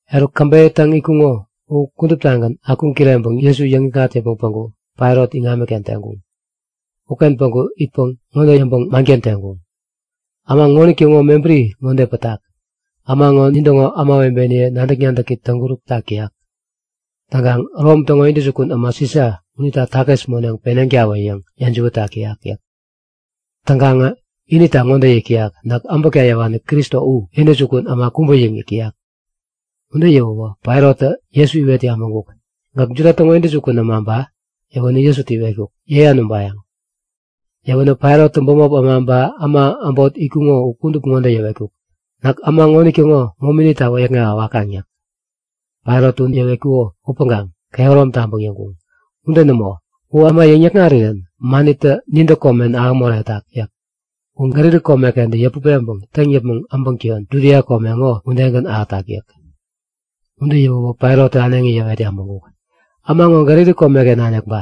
Eruk, käbeyä täŋ itkuŋo u kuduptagän akuŋ-kireŋpäŋ Jesu yäŋikŋat yäpmäŋ päŋku Pailat iŋamiken teŋkuŋ. Uken päŋku itpäŋ ŋode yäŋpäŋ manken teŋkuŋ; Äma ŋonitäŋo mebäri ŋode pätak; Äma ŋo nin täŋo ämawebeniye nadäk-nadäki täŋkuräk tak täyak. Täŋkaŋ Rom täŋo intäjukun äma Sisa unita takis moneŋ peneŋtawä yäŋ yäjiwät tak täyak yäk. Täŋkaŋä inita ŋode yäk täyak, Näk äbäkta yäwani Kristo u, intäjukun äma kubä yäŋ yäk täyak. Ude yäwäwä Pailattä Jesu iwet yabäŋkuk; Gäk Juda täŋo intäjukun äma ba? Yäwänä Jesutä iwetkuk; Yäyan ubayäŋ. Yäwänä Pailattä bämop äma ba äma äbot itkuŋo u kudup ŋode yäwetkuk; Näk äma ŋonitäŋo momita wäyäkŋewa wakaŋ yäk. Pailattä ude yäwetkuko upäŋkaŋ kehärom taŋpäŋ yäŋkuŋ; Ude nämo! U äma yäŋ-yäkŋarirän manitä nintä komen ahäŋ moretak yäk. U Galili kome-kentä yäput peŋpäŋ täŋ yäpmäŋ äbäŋ täyon Judia komeken ŋo udegän ahätak yäk. Ude yäwäwä Pailattä äneŋi yäwet yabäŋkuk; Äma ŋo Galili komeken nanik ba?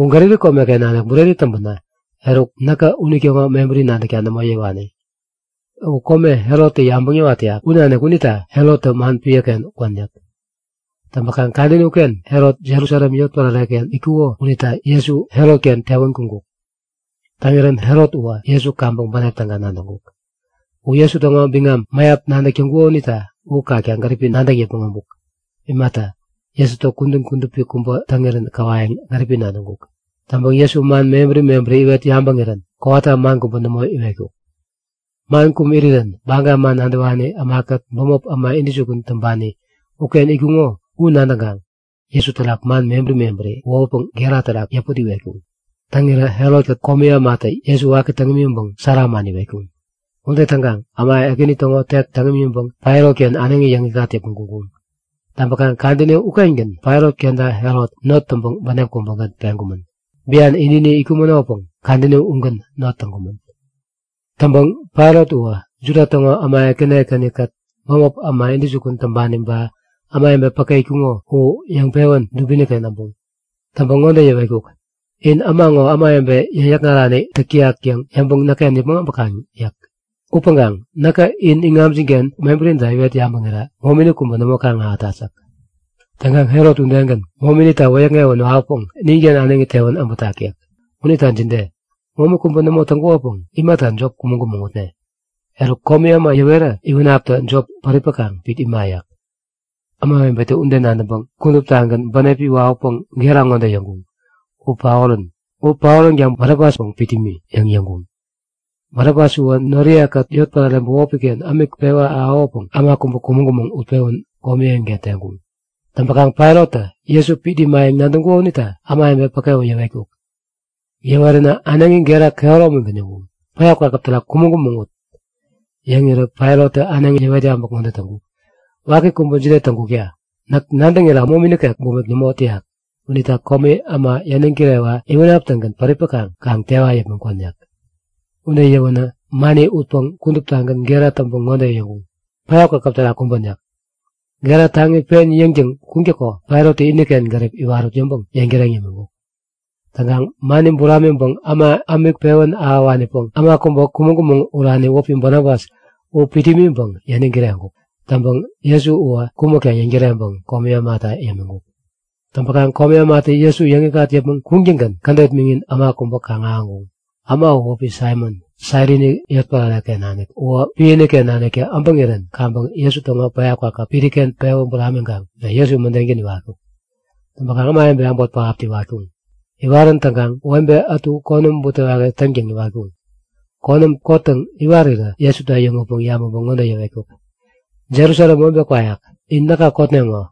U Galili komeken nanik bureni täŋpänä, eruk, näkä unitäŋo mebäri nadäkta nämo yäwani. U kome Herottä yabäŋ yäwat täyak u nanik unita Herottä man piäken kwän yäk. Täŋpäkaŋ kadäni uken Herot Jerusalem yotpärare-ken itkuko unita Jesu Herotken tewän kuŋkuk. Täŋirän Herot uwä Jesu kaŋpäŋ bänep täga nadäŋkuk. U Jesu täŋo biŋam mäyap nadäk täŋkuko unita u kakta gäripi nadäŋ yäpmäŋ äbuk. Imata Jesutä kudän kudupi kubä täŋirän käwayäŋ gäripi nadäŋkuk. Täŋpäŋ Jesu man mebäri mebäri iwet yabäŋirän kowata man kubä nämo iwetkuk. Man kum irirän Baga man nadäwani ämakät bämop äma intäjukun täŋpani uken itkuŋo u nadäŋkaŋ Jesu terak man mebäri mebäri wohutpäŋ gera terak yäput iwetkuŋ. Täŋirä Herot-kät komi ämatä Jesuta waki täŋ imiŋpäŋ sära man iwetkuŋ. Ude täŋkaŋ äma ekäni täŋo tek täŋ imiŋpäŋ Pailat-ken äneŋi yäŋikŋat yäpmäŋ kuŋkuŋ. Täŋpäkaŋ kadäni ukengän Pailat kenta Herot not täŋpäŋ bänep kubägän peŋkumän. Bian ini-ini itkumänopäŋ kadäni ugän not täŋkumän. Täŋpäŋ Pailat uwä Juda täŋo äma ekäni ekäni-kät bämop äma intäjukun täŋpani ba ämawebe päke itkuŋo u yäŋpewän dubini-kengän äbuŋ. Täŋpäŋ ŋode yäwetkuk; In äma ŋo ämawebe yäŋ-yäkŋarani täk täyak yäŋ yäŋpäŋ näkken yäpmäŋ äbäŋ yäk. Upäŋkaŋ näkä in iŋamjin-ken mebärinita iwet yabätken momini kubä nämo kaŋ-ahätat yäk. Täŋkaŋ Herot udegän, mominita wäyäkŋewän wawäpäŋ ninken äneŋi tewän äbätak yäk. Unita jide? Momi kubä nämo täŋkukopäŋ imata jop kumäŋ-kumäŋ utnek? Eruk, komi äma yäwera iwänaptä jop päripäkaŋ pit ima yäk. Ämawebetä ude nadäŋpäŋ kuduptagän bänepi wawäpäŋ gera ŋode yäŋkuŋ; U paorän! U paoränkaŋ Barabaspäŋ pit nimi! yäŋ yäŋkuŋ. Barabas uwä noriye-kät yotpärare bämopi-ken ämik pewä ahäwäpäŋ äma kubä kumäŋ-kumäŋ utpewän komi eŋiken teŋkuŋ. Täŋpäkaŋ Pailattä Jesu pit imayäŋ nadäŋkuko unita ämawebe päke u yäwetkuk. Yäweränä äneŋi gera kehäromigän yäŋkuŋ; Päya kwakäp terak kumäŋ-kumäŋ ut! Yäŋirä Pailattä äneŋi yäwet yabäk ŋode täŋkuk; Waki kubä jide täŋkukta? Näk nadäŋira momi nikek bumik nämo täyak. Unita komi äma yäniŋ kirewa iwänap-tägän päripäkaŋ kaŋ tewa yäpmäŋ kwän yäk. Ude yäwänä mani utpäŋ kuduptagän gera täŋpäŋ ŋode yäŋkuŋ; Päya kwakäp terak kumbän! yäk. Gera taŋi pen yäŋtäŋ kuŋtäko Pailattä iniken gärip iwarut yäŋpäŋ yäŋtäreŋ yämiŋkuk. Täŋkaŋ mani buramiŋpäŋ äma ämik pewän ahäwänpäŋ äma kubä kumäŋ-kumäŋ urani wäpi Barabas u pit imiŋpäŋ yäniŋ kireŋkuk. Täŋpäŋ Jesu uwä kumäkta yäŋtäreŋpäŋ komi ämata yämiŋkuk. Täŋpäkaŋ komi ämatä Jesu yäŋikŋat yäpmäŋ kuŋtäŋgän kädet miŋin äma kubä kaŋ-ahäŋkuŋ. Äma uwä wäpi Saimon, Sairini yotpärare-ken nanik. Uwä piäken naniktä äbäŋirän kaŋpäŋ Jesu täŋo päya kwakäp piriken pewä buramiŋkaŋ Jesu mädengän iwatkuk. Täŋpäkaŋ ämawebe äbot pähaptä iwatkuŋ. Iwarän täŋkaŋ webe ätu konäm butewaki täŋtäŋ iwatkuŋ. Konäm kottäŋ iwarirä Jesutä äyäŋutpäŋ yabäŋpäŋ ŋode yäwetkuk; Jerusalem webe kwayak, in näka kotneŋo.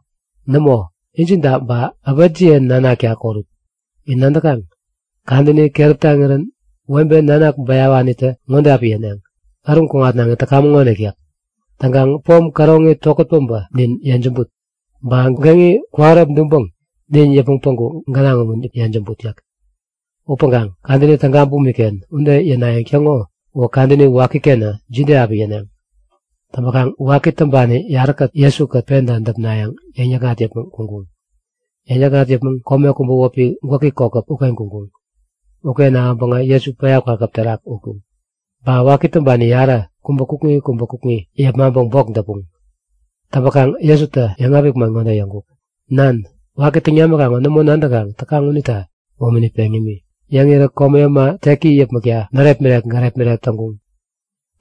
Nämo, injinta ba äpetjiye nanakta korut. In nadäkaŋ? Kadäni keräp taŋirän webe nanak bäyawanitä ŋode api yäneŋ; Äruŋ kuŋatnaŋi täkamäŋonik yäk. Täŋkaŋ pom käroŋi tokät päbä nin yejämbut! Ba geŋi kwähärep duŋpäŋ nin yäpmäŋ päŋku gänaŋ umu yejämbut! yäk. Upäŋkaŋ kadäni täga bumik-ken ude yänayäŋ täŋo uwä kadäni wakikenä jide api yäneŋ? Täŋpäkaŋ waki täŋpani yaräkät Jesu-kät penta däpnayäŋ yäŋ-yäkŋat yäpmäŋ kuŋkuŋ. Yäŋ-yäkŋat yäpmäŋ kome kubä wäpi Gwäki Kokäp uken kuŋkuŋ. Uken ahäŋpäŋä Jesu päya kwakäp terak utkuŋ. Ba waki täŋpani yarä, kubä kukŋi kubä kukŋi yepmaŋpäŋ bok däpuŋ. Täŋpäkaŋ Jesutä yäŋapik man ŋode yäŋkuk; Nan! Waki täŋ namikaŋ ŋo nämo nadäŋkaŋ täkaŋ unita momini peŋ yämi. Yäŋirän komi äma teki yäpmäkta närepmirek gärepmirek täŋkuŋ.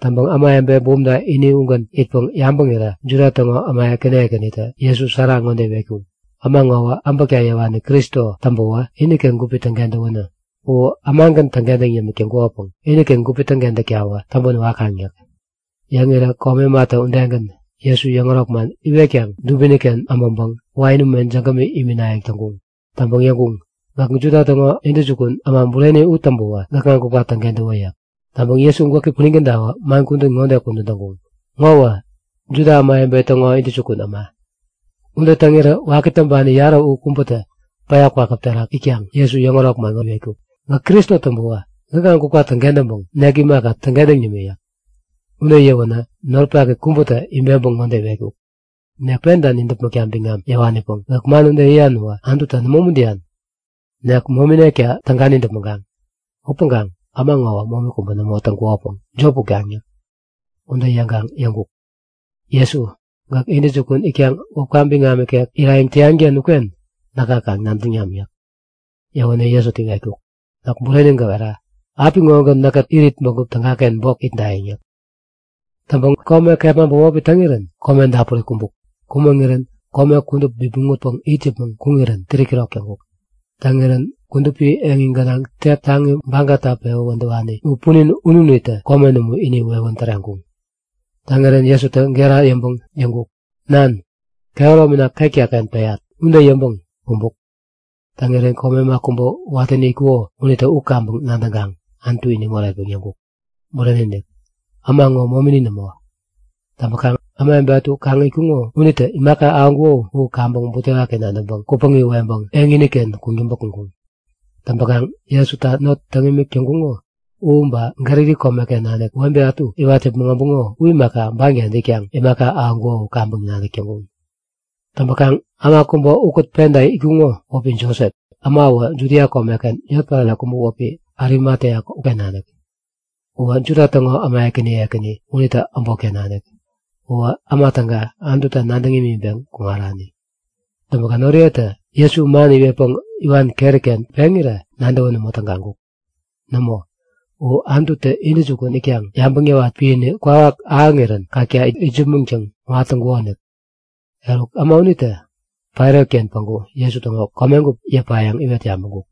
Täŋpäŋ ämawebe bumta ini ugän itpäŋ yabäŋirä Juda täŋo äma ekäni ekänitä Jesu sära ŋode iwetkuŋ; Äma ŋowä äbäkta yäwani Kristo täŋpäwä iniken gupi täŋkentäwänä. U ämagän täŋkentäŋ yämik täŋkukopäŋ iniken gupi täŋkentäktawä täŋpän wakaŋ yäk. Yäŋirä komi ämatä udegän Jesu yäŋärok man iwetkaŋ dubini-ken äbäŋpäŋ wain ume jägämi iminayäŋ täŋkuŋ. Täŋpäŋ yäŋkuŋ; Gäk Juda äma täŋo intäjukun äma bureni u täŋpäwä gäkŋa gupka täŋkentäwä yäk. Täŋpäŋ Jesu gwäki punin kädawä man kudän ŋode kudän täŋkuŋ; Ŋowä Juda Ämawebe Täŋo Intäjukun Äma. Ude täŋirä waki täŋpani yarä u kubätä päya kwakäp terak itkaŋ Jesu yäŋärok man ŋode iwetkuk; Gäk Kristo täŋpäwä gäkŋa gupka täŋkentäŋpäŋ nek imaka, täŋkentäŋ nimi! yäk. Ude yäwänä noripaki kubätä ibeŋpäŋ ŋode iwetkuk; Nek penta nidäpmäkta biŋam yäwanipäŋ, gäk man ude yäyan uwä Anututa nämo umuntäyan? Nek mominekta täga nidäpmäŋkaŋ. Upäŋ äma ŋowä momi kubä nämo täŋkukopäŋ jop utkaŋ yäk. Ude yäŋkaŋ yäŋkuk; Jesu, gäk intäjukun itkaŋ wäpka biŋam ikek irayäŋ täyan-ken uken näka kaŋ nadäŋ nam yäk. Yäwänä Jesutä iwetkuk; Näk bureni gäwera; Apiŋogän näkkät irit bägup tägaken bok itdayäŋ yäk. Täŋpäŋ kome kepma bämopi täŋirän kome dapuri kumbuk. Kumäŋirän kome kudup bipmäŋ utpäŋ it yäpmäŋ kuŋirän 3'kirok täŋkuk. Täŋirän kudupi eŋi gänaŋ tek taŋi bagata pewä wädäwani u punin ununitä komen umu ini wewän täreŋkuŋ. Täŋirän Jesutä gera yäŋpäŋ yäŋkuk; Nan! Kehäromina ketka-ken peyat! Ude yäŋpäŋ kumbuk. Täŋirän komi äma kubä watäni itkuko unitä u kaŋpäŋ nadäŋkaŋ Anutu iniŋ oretpäŋ yäŋkuk; Bureni-inik! Äma ŋo momini nämo. Täŋpäkaŋ ämawebe ätu kaŋ itkuŋo unitä imaka ahäŋkuko u kaŋpäŋ butewaki nadäŋpäŋ kupäŋi weŋpeŋ eŋini-ken kuŋtäŋpä kuŋkuŋ. Täŋpäkaŋ Jesuta not täŋ imik täŋkuŋo u ba, Galili komeken nanik webe ätu iwat yäpmäŋ äbuŋo u imaka banken itkaŋ imaka ahäŋkuŋo u kaŋpäŋ nadäk täŋkuŋ. Täŋpäkaŋ äma kubä ukät penta itkuŋo wäpi Josep. Äma uwä Judia komeken yotpärare kubä wäpi Arimatea uken nanik. Uwä Juda täŋo äma ekäni ekäni unitä äbotken nanik. U äma täga, Anututa nadäŋ imiŋpeŋ kuŋarani. Täŋpäkaŋ noriyetä Jesu man iwetpäŋ iwan keri-ken peŋirä nadäwän nämo tägaŋkuk. Nämo, u Anututä intäjukun itkaŋ yabäŋ yäwat piäni kwawak ahäŋirän kakta itsämäŋtäŋ kuŋat täŋkukonik. Eruk, äma unitä Pailat-ken päŋku Jesu täŋo komegup yäpayäŋ iwet yabäŋkuk.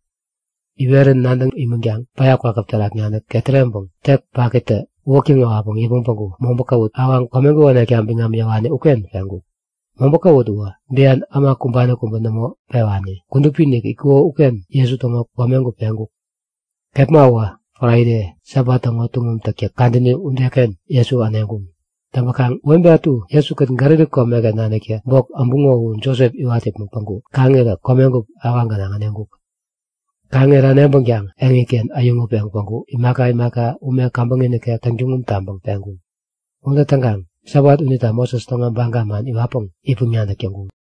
Iwerän nadäŋ imänkaŋ päya kwakäp terak nanik ketäreŋpäŋ tek pakitä uwäktäŋ-äwatpäŋ yäpmäŋ päŋku mobä kawut awaŋ komegup änekta biŋam yäwani uken peŋkuk. Mobä kawut uwä bian äma kumbani kubä nämo pewani, kudupi-inik itkuko uken Jesu täŋo komegup peŋkuk. Kepma uwä Fraide, Sabat täŋo tuŋum täktäk kadäni udeken Jesu äneŋkuŋ. Täŋpäkaŋ webe ätu Jesukät Galili komeken naniktä bok äbuŋo u Josep iwat yäpmäŋ päŋku kaŋirä komegup awaŋ gänaŋ äneŋkuk. Kaŋirä äneŋpänkaŋ eŋiken äyäŋutpeŋ päŋku imaka imaka ume käbäŋi nikek täŋtuŋum täŋpäŋ peŋkuŋ. Ude täŋkaŋ Sabat unita Moses täŋo baga man iwatpäŋ itpäŋ-nadäk täŋkuŋ.